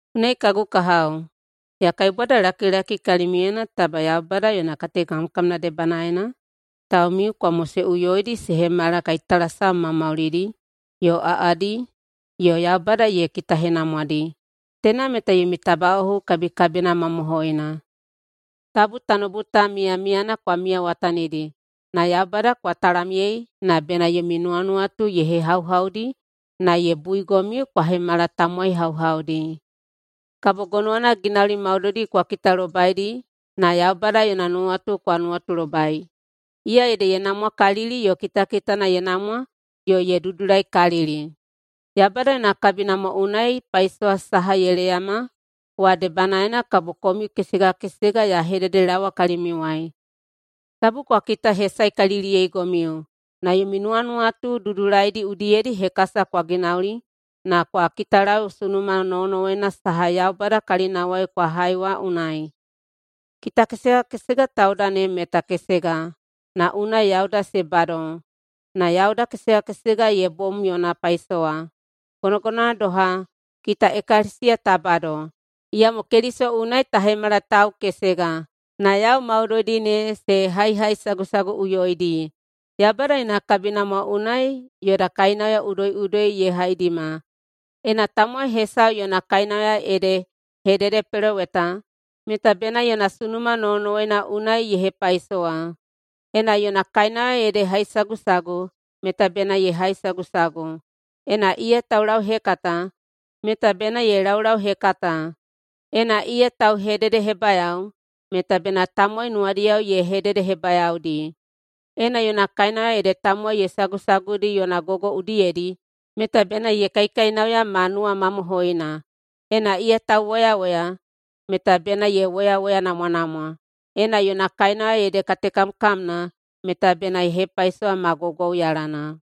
Unai, kagu kahao, ya kaibwadalakilaki kalimiuyena taba Yaubada yona katekamkamna debanaena, taumiu kwa moseꞌuyoidi se hemala kaitalasam maumaulidi yo aꞌadi yo Yaubada ye kitahenamwadi. Teina meta yomi tabaꞌohu kabikabina mamohoina. Tabu tanoubu ta miyamiyana kwa miyawatanidi, na Yaubada kwa talamyei na bena yomi nuwanuwatu ye hehauhaudi na ye buigomiu kwa hemala tamowai hauhaudi. Kabo gonowana ginauli maudoidi kwa kitalobaidi na Yaubada yona nuwatu kwa nuwatulobai, iya ede ye namwakalili yo kitakitana ye namwa yo ye dudulaikalili. Yaubada yona kabinamwa unai paisowa saha ye leyama wa debanaena kabo komiu kesega kesega ya hededelaowa kalimiuwai: Tabu kwa kitahesaekaliliyeigomiu, na yomi nuwanuwatu dudulaidi udiyedi hekasa kwa ginauli na kwa kitalau sunuma nowonowoina saha Yaubada kalinawai kwa hai wa unai. Kita kesega kesega tauda ne meta kesega, na unai yauda se bado. Na yauda kesega kesega ye bom yona paisowa. Gonogonowana doha, kita ekalesiya ta bado, iyamo Keliso unai ta hemala tau kesega, na yau maudoidi ne se haihaisagusaguꞌuyoidi. Yaubada yona kabinamwa unai yoda kainauya udoiꞌudoi ye haidima. Ena tamowai hesau yona kainauya ede hededepeloweta, meta bena yona sunuma nowonowoina unai ye hepaisowa. Ena yona kainauya ede haisagusagu, meta bena ye haisagusagu. Ena iya taulauhekata, meta bena ye laulauhekata. Ena iya tauhededehebayao, meta bena tamowai nuwadiyao ye hededehebayaodi. Ena yona kainauya ede tamowai ye sagusaguidi yona gogo udiyedi, meta bena ye kaikainauya ma nuwamamohoina. Ena iya tauwoyawoya, meta bena ye woyawoyanamwanamwa. Ena yona kainauya ede katekamkamna, meta bena ye hepaisowa ma gwaugwauyalana.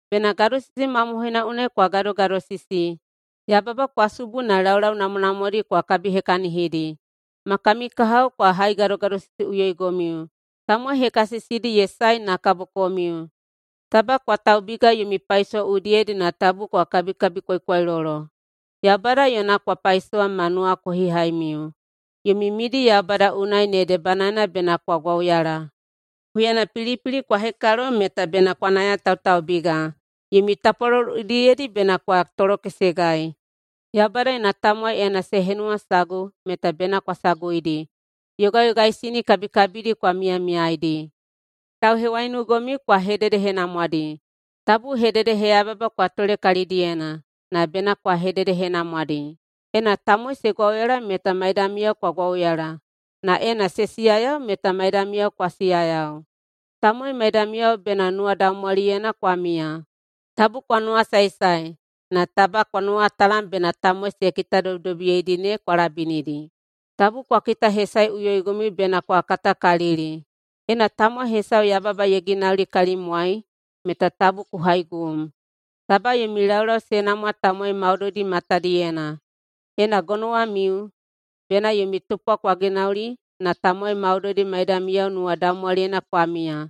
Bena gadosisi mamohoina unai kwa gadogadosisi. Yababa kwa subu na laulau namwanamwadi kwa kabihekahinidi. Ma kami kahao kwa haigadogadosisiꞌuyoigomiu. Tamowai hekasisidi ye sae na kabo komiu. Taba kwa taubiga yomi paisowa udiyedi na tabu kwa kabikabikwaikwailolo. Yaubada yona kwa paisowa ma nuwakohihaimiu. Yomi midi Yaubada unai ne debanaena bena kwa gwauyala. Huyana pilipili kwa hekalo meta bena kwa nayatautaubiga. Yomi tapwalolo udiyedi bena kwa tolokesegai. Yaubada yona tamowai ena se henuwasagu meta bena kwa saguidi. Yogayogaisini kabikabidi kwa miyamiyaeidi. Tauhewaiunugomiu kwa hededehenamwadi. Tabu hededeheyababa kwa tole kalidiyena, na bena kwa hededehenamwadi. Ena tamowai se gwauyala meta maidamiyao kwa gwauyala, na ena se siyayau meta maidamiyao kwa siyayau. Tamowai maidamiyao bena nuwadaumwaliyena kwa miya. Tabu kwa nuwasaesae, na taba kwa nuwatalam bena tamowai se kitadobidobiyeidi ne kwa labinidi. Tabu kwa kitahesaeꞌuyoigomiu bena kwa katakalili. Ena tamowai hesau yababa ye ginauli kalimiuwai meta tabu kwa haigum. Taba yomi laulau se namwa tamowai maudoidi matadiyena. Ena gonowamiu, bena yomi tupwa kwa ginauli na tamowai maudoidi maidamiyao nuwadaumwaliyena kwa miya.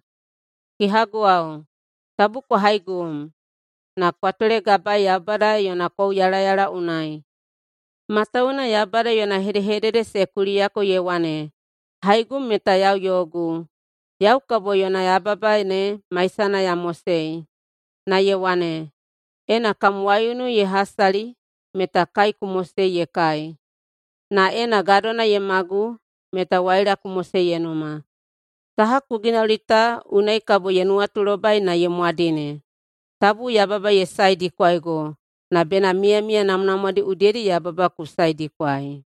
Kehaguwao, tabu kwa haigum, na kwa tolegabaei Yaubada yona kouyalayala unai, matawuwuna Yaubada yona hedehedede se kuliyako, ye wane, “Haigum meta yau yogu, yau kabo yona yababa ne maisana ya mosei.”. Na ye wane, “Ena kam waiunu ye hasali meta kai ku mosei ye kai, na ena gadona ye magu meta waila ku mosei ye numa. Saha ku ginauli ta unai kabo ye nuwatulobai na ye mwadine.” Tabu yababa ye saedikwaigo, na bena miyamiya namwanamwadi udiyedi yababa ku saedikwaei.